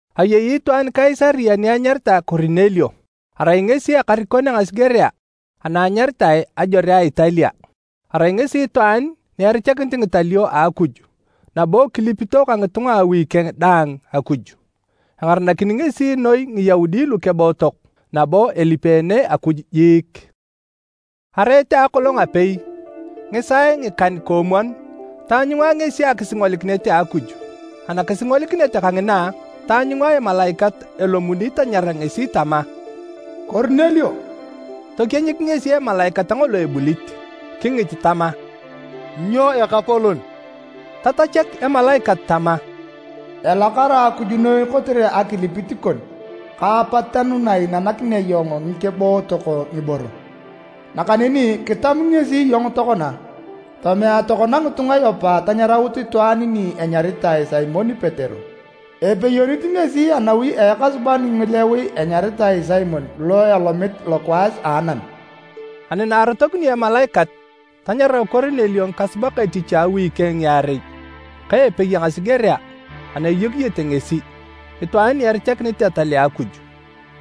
Ayei itwaan Kaisaria ni anyaritae Korinelio, arai ngesi ekarikon a ngasigerea ana anyaritae “Ajore a Italia.” Arai ngesi itwaan ni erichakinit ngitalio a Akuj nabo kilipito ka ngitunga a awi keng daang Akuj. Engaranakini ngesi noi Ngiyaudi lukebootok nabo elipeene Akuj jiik. Areet a akolong apei, ngisaae ngikan-koomwon, taanyunga ngesi akisingolikinet a Akuj. Anakisingolikinet kangina, taanyunga emalaikat a Akuj elomuni tanyara ngesi tama, “Korinelio!” Tokienyik ngesi emalaikat ngolo ebulit, kingit tama, “Nyo Ekapolon?” Tatachak emalaikat tama, “Elakara Akuj noi kotere akilipit kon ka apatanu na iinanakinea iyong ngikebootok ngiboro, nakaneni kitam ngesi iyong tokona. Tomea tokona ngitunga Yopa tanyaraut itwaan ni enyaritae Simon Petero. Epeyonit ngesi anawi a ekasuban ngilowi enyaritae Simon alo elomit lokwaas a anam.” Ani na arotokinio emalaikat, tanyarau Korinelio ngikasubak etich a awi keng ngiarei ka epei a ngasigerea ana eyokiyete ngesi, itwaan ni erichakinit etal a Akuj.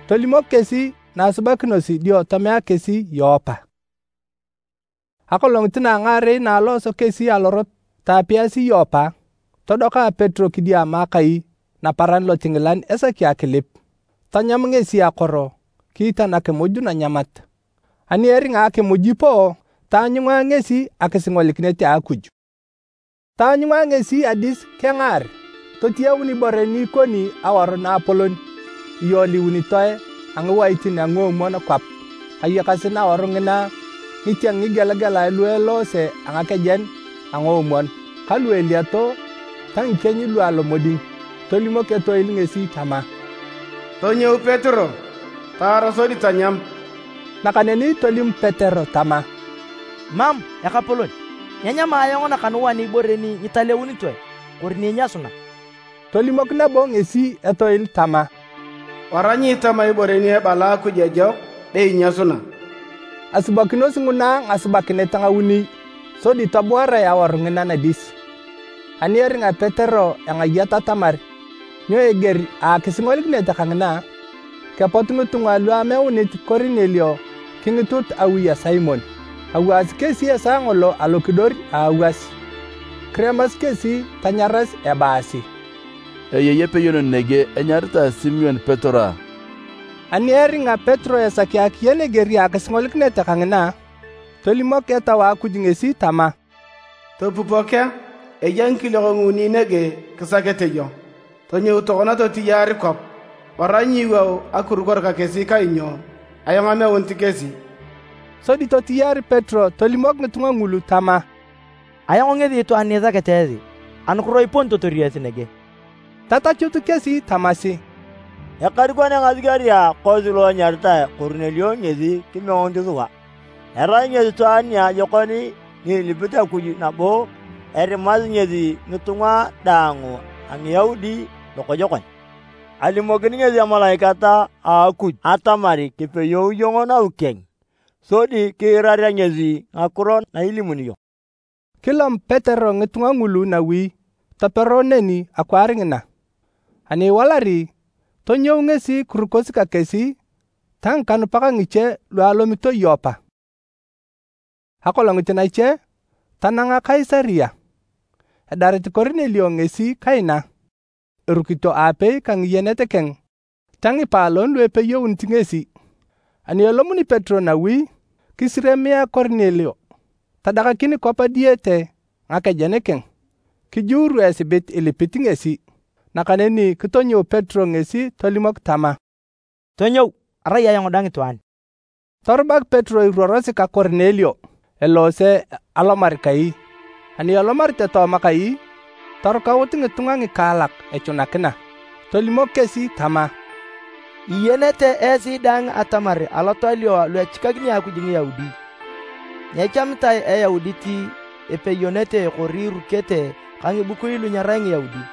Tolimok kesi na asubakinosi dio tomea kesi Yopa. Akolongit na a ngaarei na alooso kesi alorot taapiyasi Yopa, todoka Petero kidiama akai naparan lotingilan esaki akilip. Tanyam ngesi akoro kiitan akimuj nanyamat. Ani eringa akimuj ipoo, taanyunga ngesi akisingolikinet a Akuj. Taanyunga ngesi adis kengaar, totiyaun ibore ni ikoni awaru naapolon iyoliunitoe a ngiwaitin a nguomwon kwap. Ayakasi nawaru ngina ngitieng ngigelagelae lu eloose a ngakejen a ngoomwon ka lu eliato ta ngikieny lu alomoding. Tolimok etoil ngesi tama, “Tonyou Petero taar sodi tanyam!” Nakaneni tolim Petero tama, “Mam, Ekapolon! Nyenyama ayong nakanuan ibore ni nyitaleunitoe kori ni inyasuna.” Tolimok nabo ngesi etoil tama, “Wara nyiitama ibore ni ebala Akuj ejok be inyasuna.” Asubakinosi nguna ngasubakinet ngauni sodi tobuarae awaru ngina nadis. Ani eringa Petero engayat atamar nyo eger a akisingolikinet kangina, kepot ngitunga lu ameunit Korinelio kingitut awi a Simon. Awaasi kesi esaa ngolo alokidor a awas. Kiremasi kesi tanyaras ebaasi, “Eyei epeyonon nege enyaritae Simon Petero a?” Ani eringa Petero esaki akiyen eger a akisingolikinet kangina, tolimok Etau a Akuj ngesi tama, “Topupok a, eya ngikiliok nguuni nege kisakete iyong. Tonyou tokona totiyaar kwap. Wara nyiiwou akirukor ka kesi kainyo ayong ameunit kesi.” Sodi totiyaar Petero tolimok ngitunga ngulu tama, “Ayong ngesi itwaan ni isakete esi. Anukiro iponitotor esi nege?” Tatachut kesi tamasi, “Ekarikon a ngasigerea kosi lo enyaritae Korinelio ngesi kimeunit sua. Erai ngesi itwaan niajokon ni ilipit Akuj nabo erimasi ngesi ngitunga daang a Ngiyaudi lokojokon. Alimokini ngesi emalaikat a Akuj atamar kipeyou iyong nawi keng sodi kiirarea ngesi ngakiro na ilimuni iyong.” Kilom Petero ngitunga ngulu nawi topero neni akwaar ngina. Ani iwalari, tonyou ngesi kirukosi ka kesi ta ngikanupak ngiche lu alomito Yopa. Akolongit nache, tananga Kaisaria. Edarit Korinelio ngesi kaina, erukito aapei ka ngiyenet keng ta ngipaalon lu epeyeunit ngesi. Ani elomuni Petero nawi, kisiriamia Korinelio tadakakin kwap diyete ngakejen keng, kijuuru esibit ilipit ngesi. Nakaneni kitonyou Petero ngesi tolimok tama, “Tonyou, arai ayong dang itwaan.” Torubak Petero iruorosi ka Korinelio eloose alomar kai. Ani elomarete tooma kai, torukaut ngitunga ngikaalak echunakina. Tolimok kesi tama, “Iyenete esi daang atamar alotalio alu echikakini Akuj Ngiyaudi, nyechamitae Eyaudit epeyonete kori irukete ka ngibukui lu nyerai Ngiyaudi.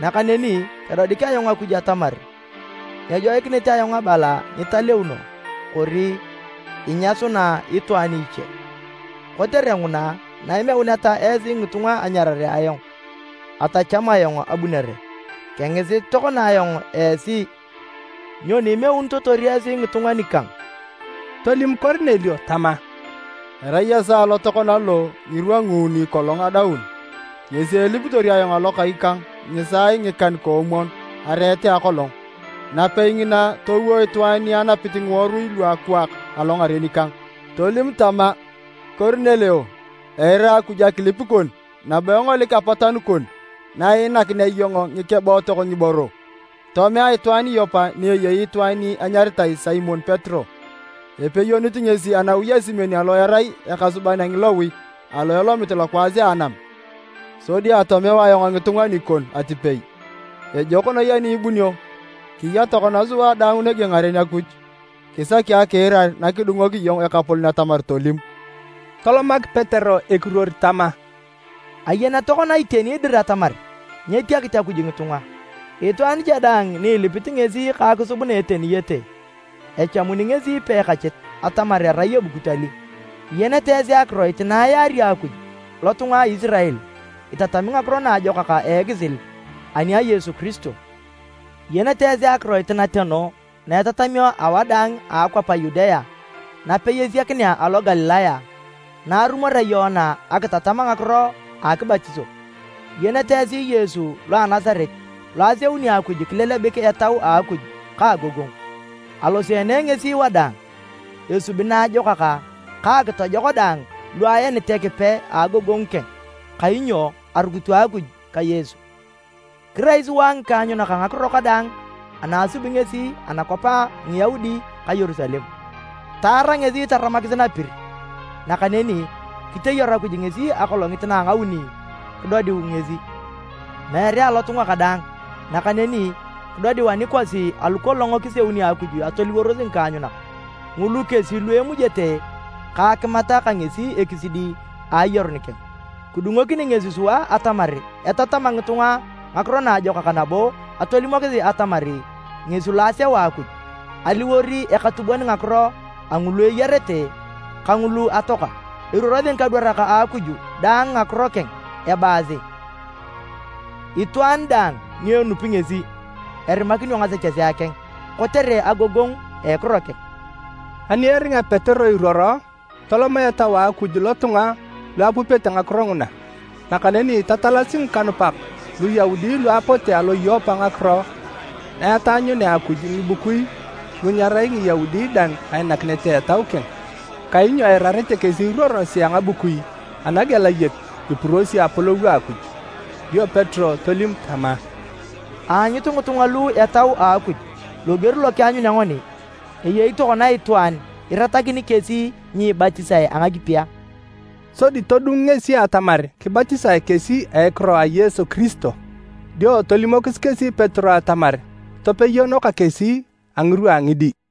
Nakaneni kedodik ayong Akuj atamar nyejoikinit ayong abala nyitaleuno, kori inyasuna itwaan iche. Kotere nguna, na imeuneta esi ngitunga anyarare ayong, atacham ayong abunere. Kengisit tokona ayong esi, nyoni imeunitotor esi ngitunga nikang?” Tolim Korinelio tama, “Arai esaa lo tokona lo, ngirwa nguuni kolong adaun, ngesi elipitor ayong alo kai kang ngisaae ngikan-koomwon areet a akolong. Napei ngina, towo itwaan ni anapit ngiworui lu akwaak alongaren kang, tolim tama, ‘Korinelio, eira Akuj akilip kon nabo engolik apatanu kon na iinanakinea iyong ngikebootok ngiboro. Tomea itwaan Yopa ni eyei itwaan ni enyaritae Simon Petero. Epeyonit ngesi a nawi a Simon alo erai ekasuban ngilowi, alo elomit lokwaas a anam.’ Sodi atomeu ayong ngitunga nikon atipei. Ejok noi ani ibunio. Kiya tokona sua daang nege ngaren Akuj, kisaki akiirar nakidungok iyong Ekapolon atamar tolim.” Tolomak Petero ekiruor tama, “Ayen tokona iteni dir atamar nyetiakit Akuj ngitunga. Itwaan cha daang ni ilipit ngesi ka akisub na eteniyete, echamuni ngesi peekachit atamar erai ebukut ali. Iyenete esi akiroit na ayaari Akuj lotunga a Isirael, itatami Ngakiro Naajokak a ekisil ani a Yesu Kiristo. Iyenete esi akiroit nateno na etatamio awadaang a akwap a Yudea napei esiakinea alo Galilaya na arumorea Yoana akitatam ngakiro a akibatiso. Iyenete esi Yesu lo a Nasaret lo aseuni Akuj kilelebik Etau a Akuj ka agogongu. Aloseene ngesi wadaang, esubi naajokak ka akitojok daang lu aenit Ekipe a agogongu keng, kainyo arukito Akuj ka Yesu. Kirai sua ngikaanyunak a ngakiro kadaang ana asubi ngesi anakwap a Ngiyaudi ka Yerusalem. Taara ngesi taramakis napir. Nakaneni kiteyaru Akuj ngesi akolongit na a ngauni kidodiu ngesi, meere alotunga kadaang, nakaneni kidodiu anikosi alu kolong kiseuni Akuj atoliworos ngikaanyunak. Ngulu kesi lu emujete ka akimat ka ngesi ekisidi a ayarun keng. Kidungokini ngesi sua atamar etatama ngitunga ngakiro naajokak nabo atolimosi atamar ngesi lo aseu Akuj aliwor ekatubon ngakiro a ngulu eyarete ka ngulu atoaka. Eruorosi ngikadwarak a Akuj daang ngakiro keng ebaasi itwaan daang ni enupi ngesi, erimakinio ngasechesea keng kotere agogongu a ekiro keng.” Ani eringa Petero iruoro, toloma Etau a Akuj lotunga lu apupete ngakiro nguna. Nakaneni tatalasi ngikanupak Luyaudi lu apote alo Yopa ngakiro na etaanyunea Akuj ngibukui lu nyerai Ngiyaudi dang ainakinet a Etau keng. Kainyo eirarete kesi iruorosi a ngabukui anagelayek ipurosi apolou a Akuj. Dio Petero tolim tama, “Aanyut ngitunga lu Etau a Akuj loger lo kianyunea ngoni. Eyei tokona itwaan iratakini kesi nyiibatisae a ngakipi a?” Sodi todung ngesi atamar kibatisae kesi a ekiro a Yesu Kiristo. Dio tolimokis kesi Petero atamar topeyono ka kesi a ngirwa a ngidi.